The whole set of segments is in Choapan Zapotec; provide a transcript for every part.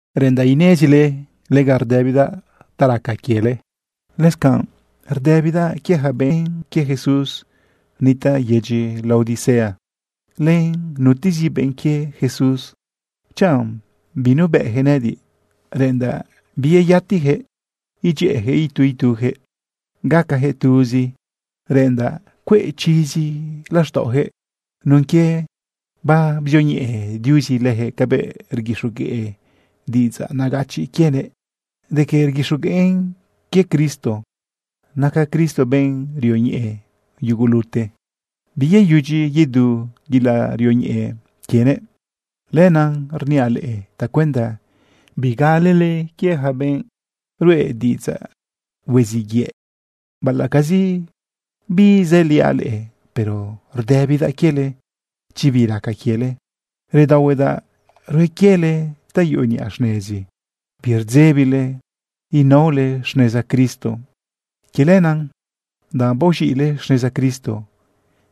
Reꞌendaꞌ inezile lega rdëbidaꞌ bi raca quiele. Lëscanꞌ rdëbidaꞌ quie yaca benꞌ quie Jesús nitaꞌ yedyi Laodicea, len nutezi benꞌ quie Jesús chanꞌ binubëꞌyaquëꞌ nëꞌëdiꞌ. Reꞌendaꞌ biyeyatiyaquëꞌ idyëꞌëyaquëꞌ itu ituyaquëꞌ gacayaquëꞌ tuzi. Reꞌendaꞌ cueꞌ chizi laxtaꞌoyaquëꞌ nun quie babzioñeꞌe Diuzi leyaquëꞌ cabëꞌ rguixogueꞌ diꞌidzaꞌ nagachiꞌ quienëꞌ de que rguixogueꞌn quie Cristo. Naca Cristo benꞌ rioñeꞌe yugulute. Biyeyudyi yedu yelaꞌ rioñeꞌe quienëꞌ. Lenaꞌ rniaꞌ leꞌe tacuenda bigalele quie yaca benꞌ ruꞌe diꞌidzaꞌ hueziꞌ yëꞌ. Baꞌalaꞌcazi bizëliaꞌ leꞌe, pero rdëbidaꞌ quiele chi bi raca quiele. Redaohuedaꞌ rue quiele ta yuꞌu niꞌa xnezi, birdzebile inaole xneza Cristo. Quie lenaꞌ, danꞌ baoz̃iꞌle xneza Cristo,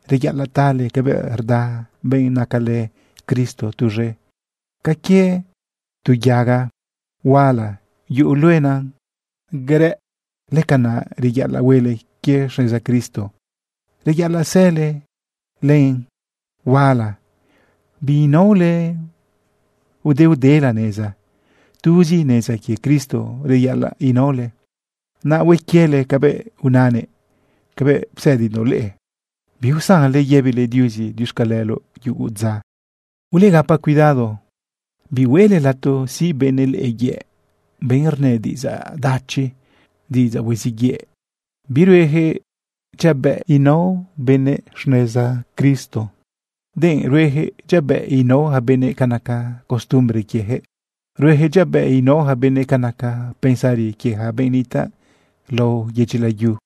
reyaꞌalaꞌ tale cabëꞌ rda benꞌ nacalë Cristo tuz̃e. Ca quie tu yaga huala yuꞌu luenan garëꞌ, lëcanaꞌ reyaꞌalaꞌ huele quie xneza Cristo, reyaꞌalaꞌ sële len huala, biinaole udeudela neza. Tuzi neza quie Cristo reyaꞌalaꞌ inaole, naꞌ hue quiele cabëꞌ unanëꞌ, cabëꞌ psëdindoꞌ leꞌe. Biusanle yëbile Diuzi diuxcaleloꞌ yugu dza. Ulegapa cuidado. Bihueꞌle lato siꞌ benëꞌ leꞌe yëꞌ, benꞌ rnë diꞌidzaꞌ dachi, diꞌidzaꞌ hueziꞌ yëꞌ. Birueyaquëꞌ dyabëꞌ inao benëꞌ xneza Cristo, denꞌ rueyaquëꞌ dyabëꞌ inao yaca benëꞌ ca naca costumbre quieyaquëꞌ. Rueyaquëꞌ dyabëꞌ inao yaca benëꞌ ca naca pensari quie yaca benꞌ nitaꞌ lao yedyi layu.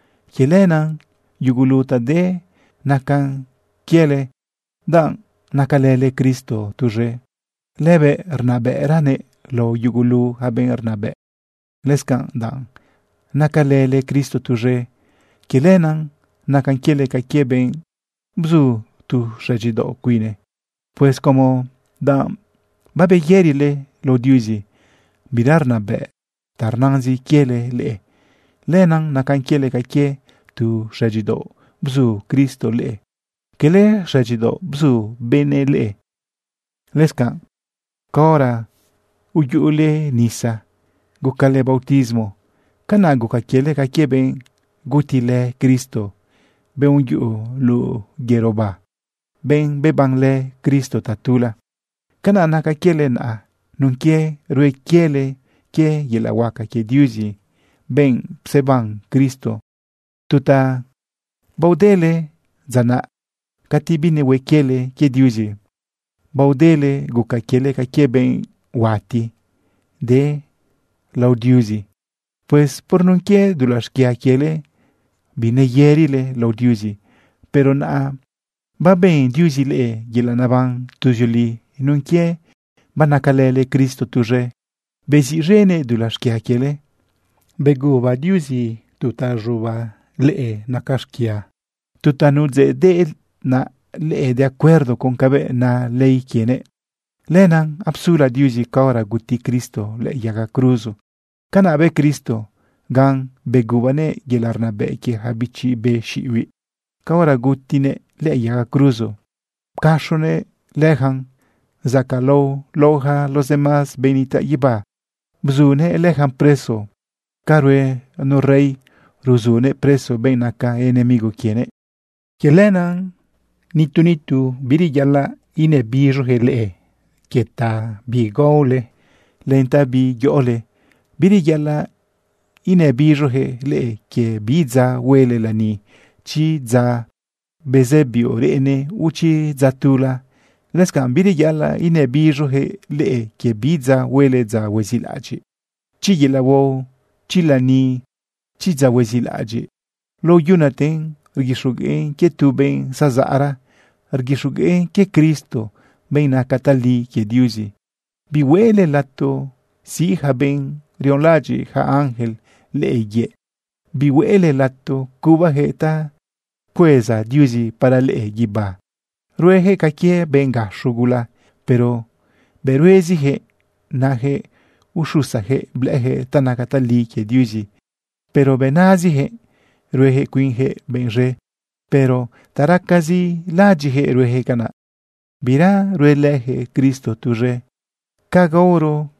Quie lenaꞌ yugulu ta de nacan quiele danꞌ nacalële Cristo tuz̃e. Lëbëꞌ rnabëꞌranëꞌ lao yugulu yaca benꞌ rnabëꞌ. Lëscanꞌ danꞌ nacalële Cristo tuz̃e, quie lenaꞌ nacan quiele ca quie benꞌ bzu tu xëdyidaoꞌ cuine. Pues como danꞌ babeyërile lao Diuzi, bira rnabëꞌ ta rnazin quiele leꞌe, lenaꞌ nacan quiele ca quie tu xëdyidaoꞌ bzu Cristo leꞌe, cala xëdyidaoꞌ bzu benëꞌ leꞌe. Lëscanꞌ caora uyuꞌule nisa gucale bautismo, canaꞌ guca quiele ca quie benꞌ gutilë Cristo, benꞌ uyuꞌu luꞌu yëroba, benꞌ bebanlë Cristo tatula. Canaꞌ naca quiele naꞌa nun quie rue quiele quie yelaꞌ huaca quie Diuzi, benꞌ pseban Cristo. Tu ta baodele dza naꞌ cati binehue quiele quie Diuzi, baodele guca quiele ca quie benꞌ huati de lao Diuzi. Pues por nun quie dulaꞌ xquia quiele, bineyërile lao Diuzi. Pero naꞌa baben Diuzi leꞌe yelaꞌ naban tuzioli nun quie banacalële Cristo tuz̃e, beziꞌz̃enëꞌ dulaꞌ xquia quiele. Beguba Diuzi tu ta z̃uba leꞌe xquia, tu ta nudzeꞌdeꞌna leꞌe de acuerdo con cabëꞌ na ley quienëꞌ. Lenaꞌ apsula Diuzi caora guti Cristo lëꞌë yaga cruzo. Canaꞌ bë Cristo gan begubanëꞌ yelaꞌ rnabëꞌ quie yaca bichi be xiꞌibiꞌ caora cati gutiguëꞌ lëꞌë yaga cruzo. Pcaxonëꞌ leyacan zacaꞌlao lao yaca los demás benꞌ nitaꞌ guibá. Bzunëꞌ leyacan preso ca rue nu rey ruzunëꞌ preso benꞌ naca enemigo quienëꞌ. Quie lenaꞌ nitu nitu bireyaꞌalaꞌ inabiz̃oyaquëꞌ leꞌe quie ta bi gaole, len ta bi yoꞌole. Bireyaꞌalaꞌ inabiz̃oyaquëꞌ leꞌe quie bi dza huele lani, chi dza bezë biuꞌ reꞌene, o chi dza tula. Lëscanꞌ bireyaꞌalaꞌ inabiz̃oyaquëꞌ leꞌe quie bi dza huele dza huezilaꞌadyiꞌ. Chi yelaꞌ huao, chi lani, chi dza huezilaꞌadyiꞌ, lao yunaten rguixogueꞌn quie tu benꞌ zazaꞌra. Rguixogueꞌn quie Cristo, benꞌ naca tali quie Diuzi. Bihueꞌle lato siꞌ yaca benꞌ rionlaꞌadyiꞌ yaca ángel leꞌe yëꞌ. Bihueꞌle lato cubayaquëꞌ ta pcueza Diuzi para leꞌe guibá. Rueyaquëꞌ ca quie benꞌ gaxo gula, pero bëꞌ rueziyaquëꞌ. Nayaquëꞌ uxusayaquëꞌ blëꞌëyaquëꞌ ta naca tali quie Diuzi, pero bëꞌ naziyaquëꞌ. Rueyaquëꞌ cuinyaquëꞌ benꞌ z̃e, pero ta racazi laꞌadyiꞌyaquëꞌ rueyaquëꞌ canaꞌ. Bira ruelëyaquëꞌ Cristo tuz̃e. Ca gaoro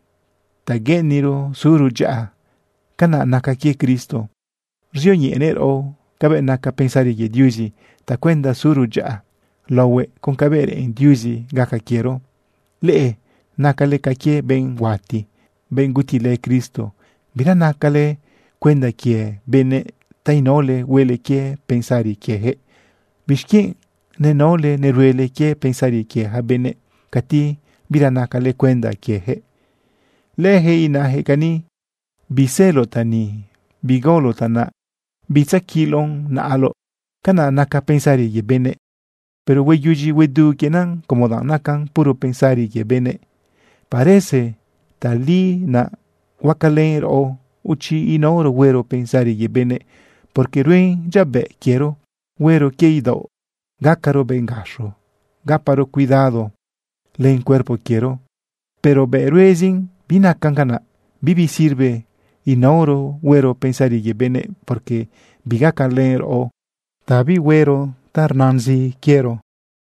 ta gueꞌeniro suro dyaꞌa, canaꞌ naca quie Cristo, ruzioñeꞌenëꞌ raꞌo cabëꞌ naca pensari quie Diuzi tacuenda suro dyaꞌa laohuëꞌ con cabëꞌ reꞌen Diuzi gaca quiero. Leꞌe nacale ca quie benꞌ huati, benꞌ gutilë Cristo. Bira nacale cuenda quie benëꞌ ta inaole huele quie pensari quieyaquëꞌ. ¿Bixquienꞌ nenaole neruele quie pensari quie yaca benëꞌ cati bira nacale cuenda quieyaquëꞌ? Leyaquëꞌ inayaquëꞌ cani: “Biseloꞌ ta ni, bigaoloꞌ ta naꞌ, bitzaquiloꞌn naꞌaloꞌ.” Canaꞌ naca pensari quie benëꞌ. Pero hueyudyi huedu quienan como danꞌ nacan puro pensarizi quie benëꞌ. Parece tali naꞌ huacalën raꞌo chi inaoro huero pensari quie benëꞌ, porque ruen dyabëꞌ quiero huero quie idaoꞌ, gacaro benꞌ gaxo, gaparo cuidado len cuerpo quiero. Pero bëꞌ ruezin binacan canaꞌ. Bibi sirve inaoro huero pensari quie benëꞌ, porque bigacalën raꞌo ta bihuero ta rnazin quiero.